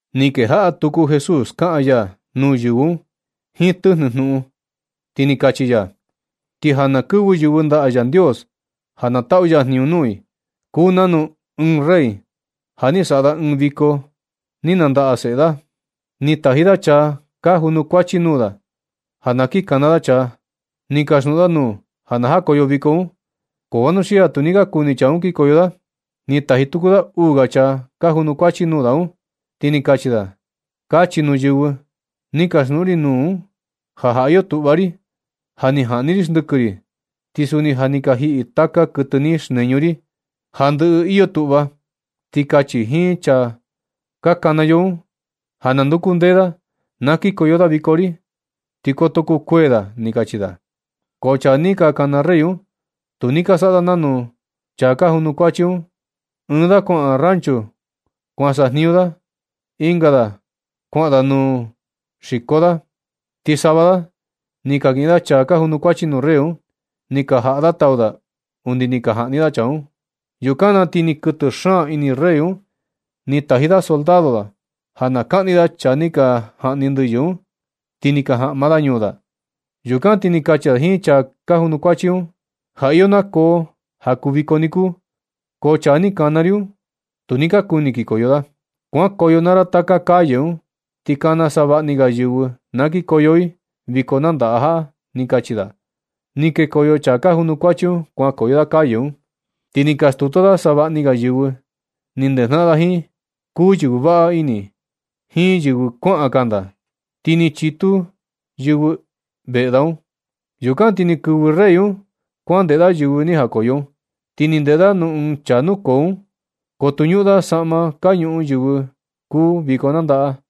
Ni kejaꞌa tuku Jesús kaꞌan ya nuu yɨvɨ un jiin tɨjnɨ jnuꞌun, ti ni kachi ya: ―Ti ja na kɨvɨ yɨvɨ ndaꞌa Yandios ja na taꞌu ya jniñu nuu i, kuu nanu ɨɨn rey ja ni saꞌa da ɨɨn viko ni nandaꞌa seꞌe da. Ni taji da chaa ka junukuachi nuu da un, ja na kin kana da chaa, ni kaxjnuꞌun da nuu ja na jakoyo viko un. Ko vanuxia tu ni ka kuni chaa un kinkoyo da. Ni taji tuku da uu ga chaa ka junukuachi nuu da un, ti ni kachi da: “Kachi nuu yɨvɨ ni kaxjnuꞌun ri nuu un ja, ja iyo tuꞌva ri. Ja ni jaꞌni ri xndɨkɨ ri, ti suni ja ni ka jiꞌi taka kɨtɨ ni xneñu ri un. Ja ni ndɨꞌɨ iyo tuꞌva ti kachi jiin chaa ka kana yo un ja na nduku ndee da, na kikoyo da viko ri, ti koto kukuee da”, ni kachi da. Ko chaa ni ka kana rey un, tu ni ka saꞌa da nanu nuu chaa ka junukuachi un. Ɨɨn da kuaꞌan rancho kuan sajniñu da. Ɨnga da kuaꞌan da nuu xiko da. Ti sava da ni ka kiꞌin da chaa ka junukuachi nuu rey un, ti ni ka jaꞌa da tau da undi ni ka jaꞌni da chaa un. Yukan na ti ni kɨtɨ xaan ini rey un, ni taji da soldado da ja na kaꞌni da chaa ni ka jaꞌni ndɨyɨ un, ti ni ka jaꞌma da ñuu da. Yukan ti ni kachi da jiin chaa ka junukuachi un: “Ja iyo nakoo ja kuu viko niku, ko chaa ni kana ri un, tu ni ka kuni kikoyo da. Kuankoyo naa ra taka calle un, ti kana savaꞌa ni ga yɨvɨ na kikoyo i viko nandaꞌa jaꞌa”, ni kachi da. Ni kekoyo chaa ka junukuachi un kuankoyo da calle un, ti ni ka stutu da savaꞌani ga yɨvɨ ni ndejnaꞌan da jiin, kuu yɨvɨ vaꞌa ini jiin yɨvɨ kuaꞌan kanda, ti ni chitu yɨvɨ un veꞌe da. Yukan ti ni kɨvɨ rey un kuandeꞌe da yɨvɨ ni jakoyo un. Ti ni ndeꞌe da nuu ɨɨn chaa nukoo un, ko tu ñuꞌun da saꞌma ka ñuꞌun yɨvɨ kuu viko nandaꞌa.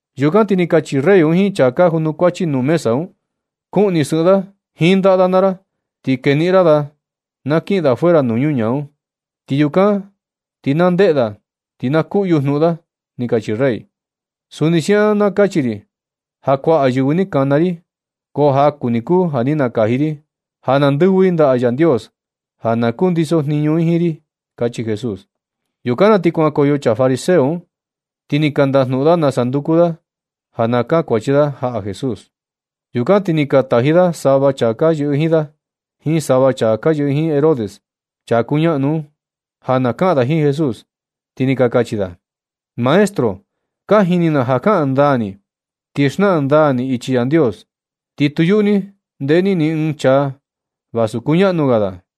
Yukan ti ni kachi rey un jiin chaa ka janukuachi nuu mesa un: “Kuꞌni sɨꞌɨn da jiin ndaꞌa da naa ra, ti keniꞌin ra da na kiꞌin da fuera nuu ñaa un. Ti yukan na ti na ndeꞌe da, ti na kuꞌyu jnuꞌun da”, ni kachi rey. Suni siaꞌan na kachi ri ja kuaꞌa yɨvɨ ni kana ri, ko jaku ni kuu ja ni nakaji ri ja na ndɨvɨ i ndaꞌa Yandios ja na kundiso jniñu i jiin ri ―kachi Jesús. Yukan na ti kuankoyo chaa fariseo un ti ni ka ndajnuꞌun da nasa nduku da, ja na kankuachi da jaꞌa Jesús. Yukan ti ni ka taji da sava chaa ka yɨꞌɨ jiin da, jiin sava chaa ka yɨꞌɨ jiin Herodes chaa kuñaꞌnu un, ja na kaꞌan da jiin Jesús, ti ni ka kachi da: ―Maestro, ka jini na ja kaꞌan ndaa ni, ti xnaꞌan ndaa ni ichi Yandios, ti tu yuꞌu ni ndeꞌe ni ni ɨɨn chaa vasu kuñaꞌnu ga da.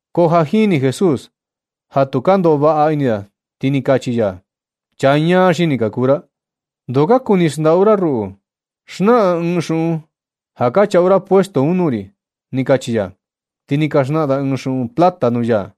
Ko ja jini Jesús ja tu ka ndoꞌo vaꞌa ini da, ti ni kachi ya: ―Chaa ñaa xini ka kuu ra. ¿Ndoo ka kuni xndaꞌu ra ruꞌu? Xnaꞌan ɨɨn xuꞌun ja ka chaꞌu ra puesto un nuu ri ―ni kachi ya. Ti ni ka xnaꞌan da ɨɨn xuꞌun plata nuu ya.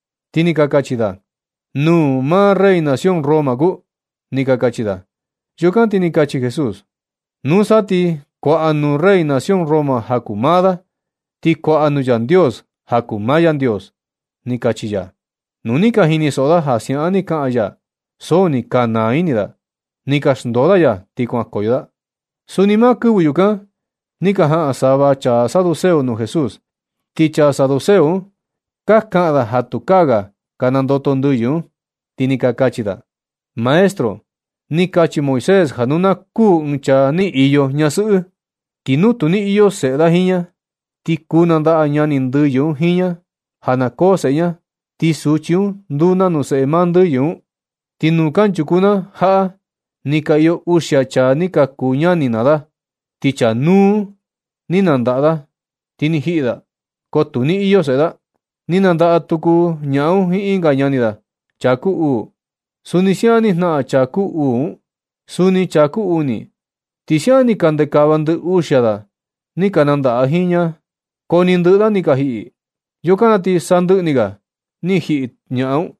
Ti ni ka kachi da: ―Nūū maa rey nación Roma kuu ―ni ka kachi da. Yukan ti ni kachi Jesús: ―Nusa ti kuaꞌa nuu rey nación Roma ja kuu maa da, ti kuaꞌa nuu Yandios ja kuu maa Yandios ―ni kachi ya. Nu ni ka jinisoꞌo da ja siaꞌan ni kaꞌan ya, so ni ka naa ini da. Ni ka xndoo da ya, ti kuankoyo da. Suni maa kɨvɨ yukan, ni ka jaꞌan sava chaa saduceo nuu Jesús. Ti chaa saduceo un ka kaꞌan da ja tukaa ga ka nandoto ndɨyɨ un, ti ni ka kachi da: ―Maestro, ni kachi Moisés ja nu na kuū ɨɨn chaa ni iyo ñasɨꞌɨ, ti nu tu ni iyo seꞌe da jiin ña, ti kuu nandaꞌa ñani ndɨyɨ un jiin ña ja na koo seꞌe ña, ti suchi un nduu nanu seꞌe maa ndɨyɨ un. Ti nuu kanchuku na jaꞌa ni ka iyo uxia chaa ni ka kuu ñani naa da. Ti chaa núú un ni nandaꞌa da, ti ni jiꞌi da, ko tu ni iyo seꞌe da. Ti nandaꞌa tuku ñaꞌan un jiin ɨnga ñani da, chaa kuu uu. Suni siaꞌan ni jnaꞌan chaa kuu uu un, suni chaa kuu uni, ti siaꞌan ni ka ndekava ndɨ uxia da ni ka nandaꞌa jiin ña, ko ni ndɨꞌɨ da ni ka jiꞌi. Yukan na ti sandɨꞌɨ ni ga, ti ni jiꞌi ñaꞌan un.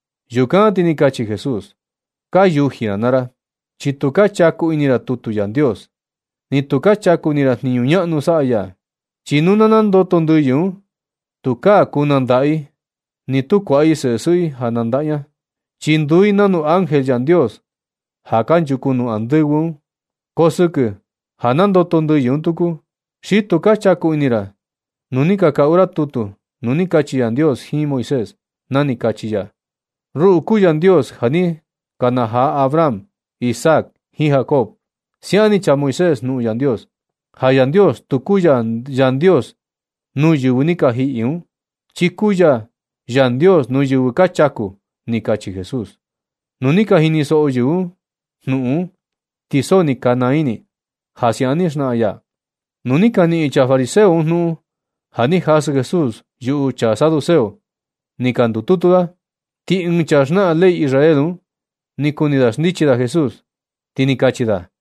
Yukan na ti ni kachi Jesús: ―Ka yuji ra naa ra, chi tu ka chaku ini ra tutu Yandios, ni tu ka chaku ini ra jniñu ñaꞌnu saꞌa ya. Chi nu na nandoto ndɨyɨ un, tukaa kuu nandaꞌa i, ni tu kuaꞌa i seꞌe sɨꞌɨ i ja na nandaꞌa ña, chi nduu i nanu ángel Yandios ja kanchuku nuu andɨvɨ un. Ko sɨkɨ ja nandoto ndɨyɨ un tuku, xi tu ka chaku ini ra nu ni ka kaꞌu ra tutu, nu ni kachi Yandios jiin Moisés, na ni kachi ya: “Ruꞌu kuu Yandios ja ni kanajaa Abraham, Isaac jiin Jacob.” Siaꞌan ni chaa Moisés jnuꞌun Yandios, ja Yandios tu kuu ya Yandios nuu yɨvɨ ni ka jiꞌi un, chi kuu ya Yandios nuu yɨvɨ ka chaku ―ni kachi Jesús. Nu ni ka jinisoꞌo yɨvɨ un jnuꞌun un, ti so ni ka naa ini i ja siaꞌan ni xnaꞌan ya. Nu ni ka niꞌin chaa fariseo jnuꞌun ja ni jasɨ Jesús yuꞌu chaa saduceo, ni ka ndututu da. Ti ɨɨn chaa xnaꞌan ley Israel un ni kuni da xndichi da Jesús, ti ni kachi da: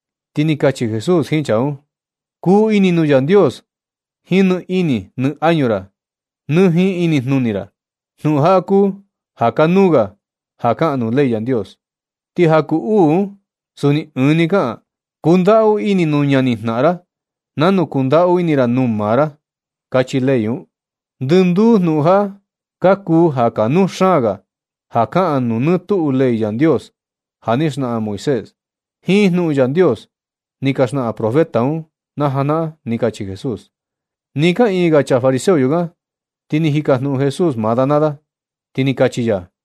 Ti ni kachi Jesús jiin chaa un: ―“Kuu ini nuu Yandios jiin nɨ ini nɨ añu ra, nɨ jiin inijnuni ra.” Jnuꞌun jaꞌa kuu ja kanuu ga ja kaꞌan nuu ley Yandios. Ti ja kuu uu un, suni ɨɨn ni kaꞌan: “Kundaꞌu ini nuu ñanijnaꞌan ra nanu kundaꞌu ini ra nuu maa ra”, kachi ley un. Ndɨnduu jnuꞌun jaꞌa ka kuu ja kanuu xaan ga ja kaꞌan nuu nɨ tuꞌu ley Yandios ja ni xnaꞌan Moisés, jiin jnuꞌun Yandios ni ka xnaꞌan profeta un na janaꞌan―ni kachi Jesús. Nɨ kaꞌiin ga chaa fariseo yukan, ti ni jikajnuꞌun Jesús maa da naa da, ni kachi ya: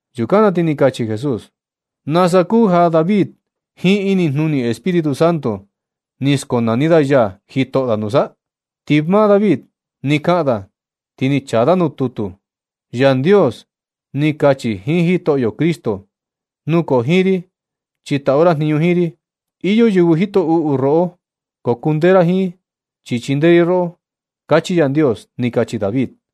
Yukan na ti ni kachi Jesús: ―¿Nasa kuu ja David jiin inijnuni Espíritu Santo ni skonani da ya jitoꞌo da nusa? Ti maa David ni kaꞌan da, ti ni chaa da nuu tutu: Yandios ni kachi jiin Jitoꞌyo Cristo: “Nukoo jiin ri, chi taꞌu ra jniñu jiin ri. Iyo yɨvɨ jito uꞌu roꞌo ko kundee ra jiin, chi chindee ri roꞌo.” Kachi Yandios, ni kachi David.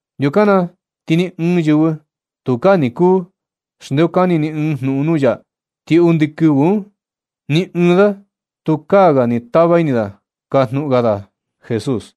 Yukan na ti ni ɨɨn yɨvɨ tukaa ni kuu xndeokani ni ɨɨn jnuꞌun nuu ya. Ti undi kɨvɨ un, ni ɨɨn da tukaa ga ni tava ini da kajnuꞌun ga da Jesús.